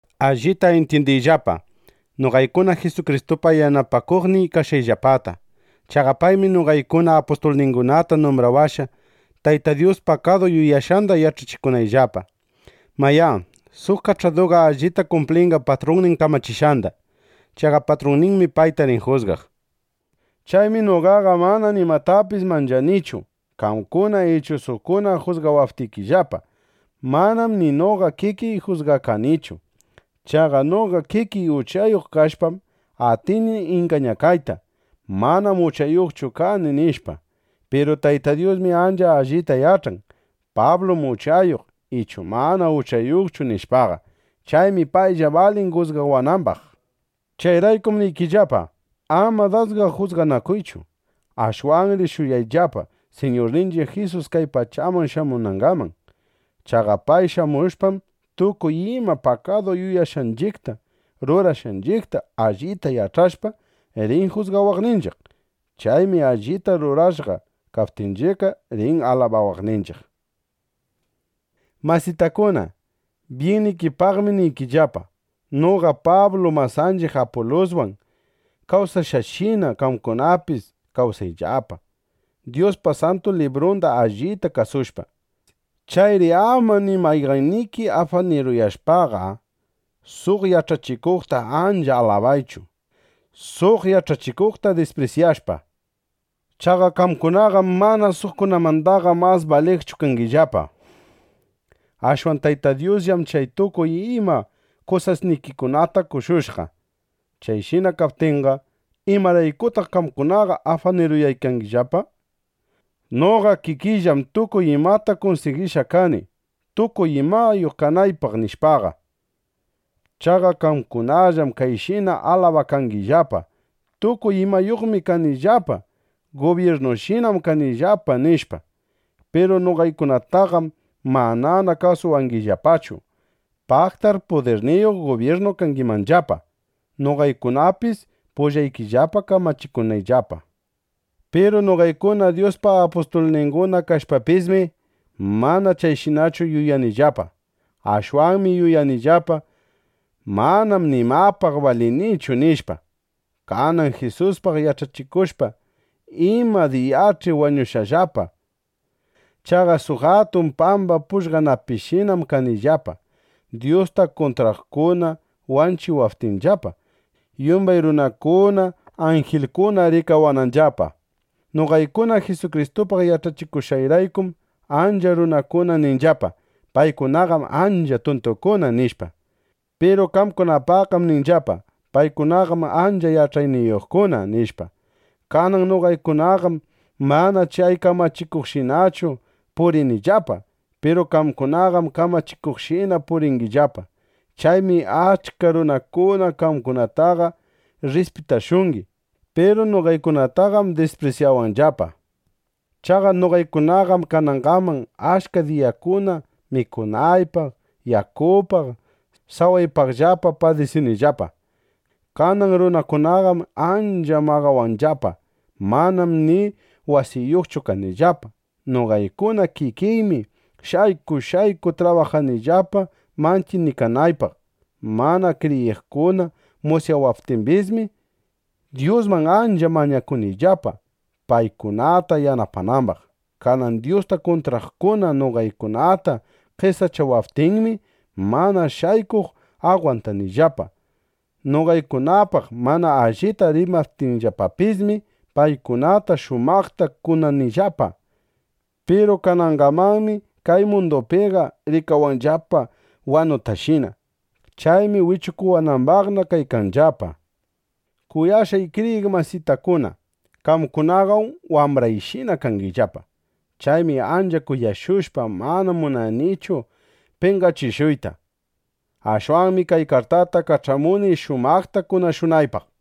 Allita intyindiyllapa noqaykuna Jisukristupa yanapakuqnin kashqayllapata. Chaqa paymi noqaykuna apustulningunata numbrawashqa, Tayta Dyus pakadu yuyashqanda yach'achikunayllapa. Mayá, suq kach'aduqa allita kumplinqa patrunnin kamachishqanda. (Chaqa patrunninmi payta rin jusgaq.) Chaymi noqaqa mana nimatapis manchanichu, qamkuna ichu suqkuna jusgawaptikillapa. Manam ni noqa kikiy jusgakanichu. Chaqa noqa kikiy uchayuq kashpam, atini ingañakayta: Manam uchayuqchu kani, nishpa. Piru Tayta Dyusmi ancha allita yach'an: Pablum uchayuq ichu mana uchayuqchu, nishpaqa. Chaymi paylla balin jusgawanambaq. Chayraykum niykillapa, ama dasqa jusganakuychu. Ashwanri shuyayllapa, Siñurninchiq Jisus kay pachaman shamunangaman. Chaqa pay shamushpam, tukuy ima pakadu yuyashqanchiqta, rurashqanchiqta allita yach'ashpa, rin jusgawaqninchiq. Chaymi allita rurashqa kaptinchiqqa, rin alabawaqninchiq. Masitakuna, byinnikipaqmi niykillapa, noqa Pablu masanchiq Apuluswan kawsashqayshina, qamkunapis kawsayllapa, Dyuspa Santu Librunda allita kasushpa. Chayri ama ni mayqanniki afaniruyashpaqa, suq yach'achikuqta ancha alabaychu, suq yach'achikuqta disprisyashpa. Chaqa qamkunaqam mana suqkunamandaqa mas baliqchu kangillapa. Ashwan Tayta Dyusllam chay tukuy ima kusasnikikunata qoshushqa. Chayshina kaptinqa, ¿imaraykutaq qamkunaqa afaniruyangillapa: Noqa kikiyllam tukuy imayta kunsigishqa kani, tukuy imayuq kanaypaq, nishpaqa? Chaqa qamkunallam kayshina alabakangillapa: Tukuy imayuqmi kanillapa. Gubyirnushinam kanillapa, nishpa. Piru noqaykunataqam manana kasuwangillapachu. Paqtar pudirniyuq gubyirnu kangimanllapa, noqaykunapis pullaykillapa kamachikunayllapa. Piru noqaykuna Dyuspa apustulninguna kashpapismi, mana chayshinachu yuyanillapa. Ashwanmi yuyanillapa: Manam nimapaq balinichu, nishpa. Kanan Jisuspaq yach'achikushpa, ima diyach'i wañushaqllapa. Chaqa suq atun pamba pugllanapishinam kanillapa, Dyusta kuntraqkuna wanchiwaptinllapa, yumbay runakuna, anjilkuna rikawananllapa. Noqaykuna Jisukristupaq yach'achikushqayraykum, achka runakuna ninllapa: “Paykunaqam ancha tuntukuna”, nishpa. Piru qamkunapaqqam ninllapa: “Paykunaqam ancha yach'ayniyuqkuna”, nishpa. Kanan noqaykunaqam mana chay kamachikuqshinachu purinillapa. Piru qamkunaqam kamachikuqshina puringillapa. Chaymi achka runakuna qamkunataqa rrispitashungi. Piru noqaykunataqam disprisyawanllapa. Chaqa noqaykunaqam kanangaman achka diyakuna mikunaypaq, yakupaq, sawaypaqllapa padisinillapa. Kanan runakunaqam ancha maqawanllapa. Manam ni wasiyuqchu kanillapa. Noqaykuna kikiymi shayku shayku trabajanillapa mantyinikanaypaq. Mana kriyiqkuna musyawaptimbismi, Dyusman ancha mañakunillapa, paykunata yanapanambaq. Kanan Dyusta kuntraqkuna noqaykunata qesachawaptinmi, mana shaykuq agwantanillapa. Noqaykunapaq mana allita rimaptinllapapismi, paykunata shumaqta kunanillapa. Piru kanangamanmi kay mundupiqa rikawanllapa wanutashina. Chaymi wichukuwanambaqna kaykanllapa. Kuyashqay kriyiq masitakuna, qamkunaqam wambrayshina kangillapa. Chaymi ancha kuyashushpa, mana munanichu penqachishuyta. Ashwanmi kay kartata kach'amuni, shumaqta kunashunaypaq.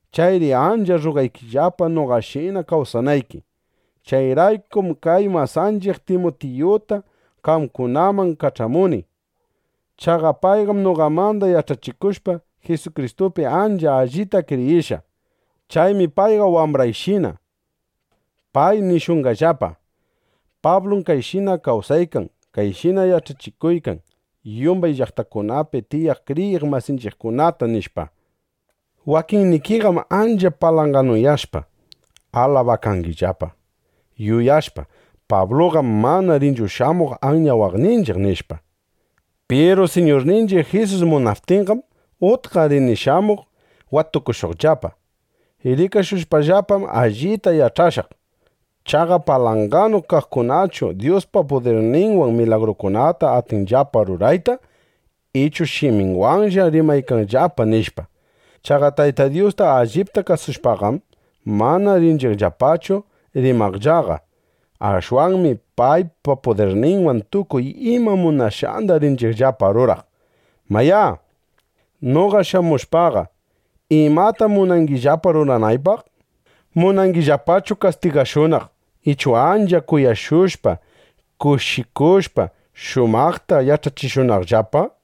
Chayri ancha rrugaykillapa, noqashina kawsanayki. Chayraykum kay masanchiq Timutiyuta qamkunaman kach'amuni. (Chaqa payqam, noqamanda yach'akushpa, Jisukristupi ancha allita kriyishqa.) Chaymi payqa wambrayshina. Pay nishunqallapa: “Pablum kayshina kawsaykan, kayshina yach'achiykan yumbay llaqtakunapi tiyaq kriyiq masinchiqkunata”, nishpa. Wakinnikiqam ancha palanganuyashpa, alabakangillapa, yuyashpa: Pabluqam mana rinchu shamuq anyawaqninchiq, nishpa. Piru Siñurninchiq Jisus munaptinqam, utqa rini shamuq watukushuqllapa. Rikashushpallapam, allita yach'ashaq: Chay palanganu kaqkunachu Dyuspa pudirninwan milagrukunata atinllapa rurayta, ichu shiminwanlla rimaykanllapa, nishpa. Chaqa Tayta Dyusta allipta kasushpaqam, mana rinchiqllapachu rimaqllaqa. Ashwanmi paypa pudirninwan tukuy ima munashqanda rinchiqllapa ruraq. Mayá, noqa shamushpaqa, ¿imatam munangillapa ruranaypaq? ¿Munangillapachu kastigashunaq, ichu ancha kuyashushpa, kushikushpa, shumaqta yach'achishunaqllapa?